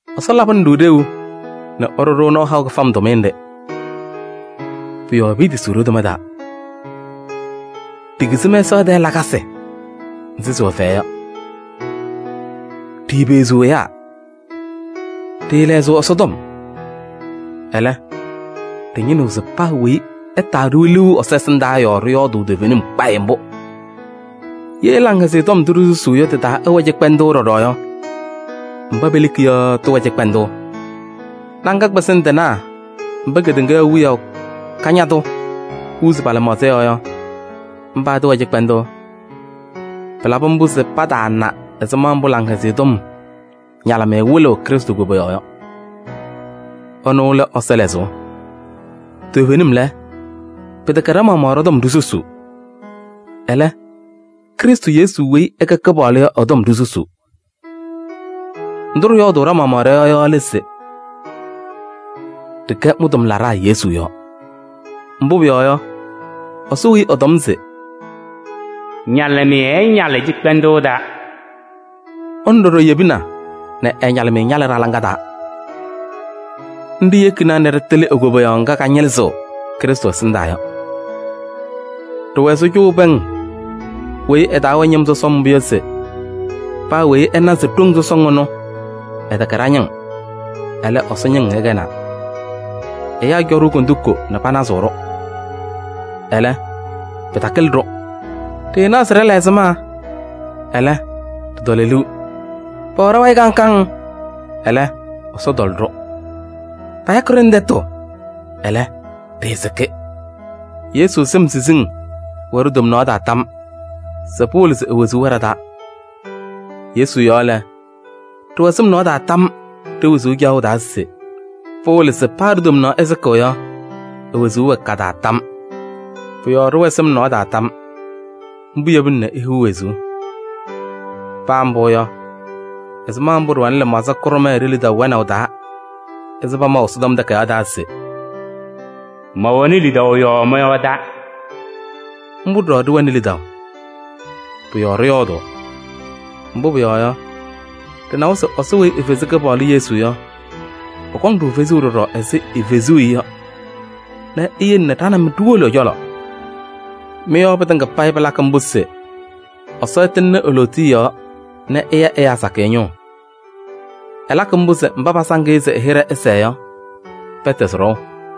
Ɛsɔ labɩnɩ-ɖʋ ɖeu nɛ ɛɖʋ-ɖʋ nɔɔ haʋ kɩfam tʋmɩyɛ nɖɩ. Pʋ-yɔɔ piitisiɣ ɖo-toma taa. Ɖikizi mɛsaɣ tɛɛ lakasɩ nzɩ sɩwɛ fɛyɛ yɔ. Ɖiipeɣziɣ ɛyaa, ɖɩɩlɛɣzɩɣ Ɛsɔtɔm. Ɛlɛ, ɖɩñɩnɩɣ se paa weyi ɛtaa-ɖʋ liu Ɛsɔ ɛsɩndaa yɔɔ ɖɩyɔɔdʋʋ toovenim kpayɩ mbʋ. Ye Laŋhɛzɩyɛ Tɔm ndʋ ɖisusuu yɔ tɩ-taa ɛwɛ cɩkpɛndʋʋ ɖɔɖɔ yɔ, mba peleki yɔ tɩwɛ cɩkpɛndʋʋ. Laŋa kpɩzɩŋ tɩnaa mba kedeŋa wiyaʋ kañadʋ huuzi pa-lɩmaɣza yɔɔ yɔ, mba tɩwɛ cɩkpɛndʋʋ. Pɩlabɩ mbʋ se pataana ɛzɩma mbʋ Laŋhɛzɩyɛ Tɔm ñalɩmɩyɛ wɩlɩɣ Krɩstʋ koboyaɣ yɔ. Ɛnʋ lɛ Ɛsɔ lɛzʋʋ. Toovenim lɛ, pɩtɛkɛ ɖa-maɣmaɣ ɖɔ-tɔm ɖisusuu. Ɛlɛ, Krɩstʋ Yesu weyi ɛkɛ Kɩpaɣlʋ yɔ ɛ-tɔm ɖisusuu. Ndʋ ɖɩyɔɔdʋʋ ɖa-maɣmaɣ ɖɔ-yɔɔ yɔ lɛ se: ɖɩkɛ mɩ-tʋmlaɖaa Yesu yɔɔ. Mbʋ pʋyɔɔ yɔ, Ɛsɔ weyi ɛtɔm se: “Ñalɩmɩyɛ ɛñalɩ cɩkpɛndʋʋ taa” yɔ, ɛnʋ ɖɔɖɔ yebina nɛ ɛ-ñalɩmɩyɛ ñalɩ ɖa-laŋa taa. Nɖɩ yekina se ɖɩtɩlɩ e-koboyaɣ ŋga kañɩlɩzɩɣ Krɩstʋ ɛsɩndaa yɔ. Ɖɩwɛ ɛzɩ cʋʋ pɛŋ weyi ɩ-taa wɛ ñɩm sɔsɔm mbʋ yɔ se paa weyi ɛna se ɖoŋ sɔsɔŋ ɛnʋ ɛtɛkɛ ɖa-ñɩŋ, ɛlɛ Ɛsɔ ñɩŋ ɛkɛnaa. Ɛyaa cɔ-ɖʋ kondiko nɛ panazɩɣ-ɖʋ, ɛlɛ, pɩtakɩlɩ-ɖʋ. Ɖɩɩnaɣ se ɖɩla ɛzɩma, ɛlɛ, ɖɩtɔlɔ liu. Pɛwɛ ɖa-wayɩ kaŋ kaŋ, ɛlɛ, Ɛsɔ tɔlɔ-ɖʋ. Payakɩ-ɖʋ nɛ tɛtʋ, ɛlɛ, ɖɩɩsɩkɩ. Yesu sɩm siziŋ wɛ ɖo-tomnaɣ taa tam se pɩwɩlɩ se e-wezuu wɛ ɖa-taa. Yesu yɔɔ lɛ, ɖɩwɛ sɩm nɔɔ taa tam ɖe-wezuu caɣʋ taa se pɩwɩlɩ se paa ɖo-tomnaɣ ɛsɩkɩ yɔ, e-wezuu wɛ ka-taa tam. Pʋ-yɔɔ ɖɩwɛ sɩm nɔɔ taa tam. Mbʋ yebini ihiɣ wezuu. Paa mbʋ yɔ, ɛzɩma mbʋ ɖɩwɛnɩ lɩmaɣza kʋɖʋma ɖe-lidaʋ wɛnaʋ taa ɛzɩ pamaʋ Ɛsɔtɔm Takayaɣ taa se: “Mɛwɛnɩ lidaʋ yɔɔ mɔyɔɔdaa” yɔ, mbʋ ɖɔɖɔ ɖɩwɛnɩ lidaʋ. Pʋ-yɔɔ ɖɩyɔɔdʋʋ. Mbʋ pʋyɔɔ yɔ, ɖɩnawa se Ɛsɔ weyi efezi Kɩpaɣlʋ Yesu yɔ, ɛkɔŋ-ɖʋ fezuu ɖɔɖɔ ɛzɩ efezuu-i yɔ nɛ eyele ɖa nɛ mɩ ɖiwolo ɛ-cɔlɔ. Mɩ-yɔɔ pɩtɩŋa payɩ pɩlakɩ mbʋ se Ɛsɔ ɛtɩŋnɩ e-lootiye yɔɔ nɛ ɛya ɛyaa sakɩyɛ ñʋʋ. Ɛlakɩ mbʋ se mba pasaŋ-ɩ se ɛ-hɩɖɛ sɛɛ yɔ, pɛtɛzɩ ɖɔʋ.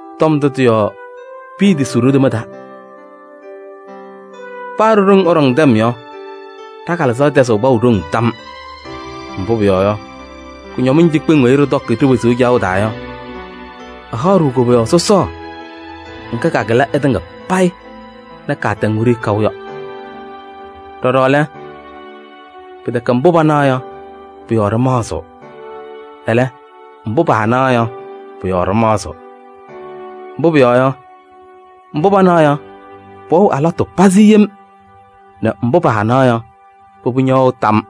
Tɔm ndʋ tɩ-yɔɔ piitisiɣ ɖo-toma taa. Paa ɖo-ɖoŋ ɛɖɔŋ tɛm yɔ, ɖa-kalɩzaɣ tɛzɩɣ kpaʋ ɖoŋ tam. Mbʋ pʋyɔɔ yɔ, kʋñɔmɩŋ cikpeŋ weyi ɖɩtɔkɩ ɖe-wezuu caɣʋ taa yɔ, ɩhaɣ-ɖʋ koboyaɣ sɔsɔɔ ŋga kakɩlɩ ɩtɩŋa payɩ nɛ kaatɛŋ wiɖiyi kaʋ yɔ. Ɖɔɖɔ lɛ, pɩtɛkɛ mbʋ panaɣ yɔ, pʋ-yɔɔ ɖɩmaɣzɩɣ. Ɛlɛ, mbʋ paanaɣ yɔ, pʋ-yɔɔ ɖɩmaɣzɩɣ. Mbʋ pʋyɔɔ yɔ, mbʋ panaɣ yɔ, pɩwɛɣ alɩwaatʋ pazɩ yem nɛ mbʋ paanaɣ yɔ, pʋbʋ ñɛwɛɣ tam.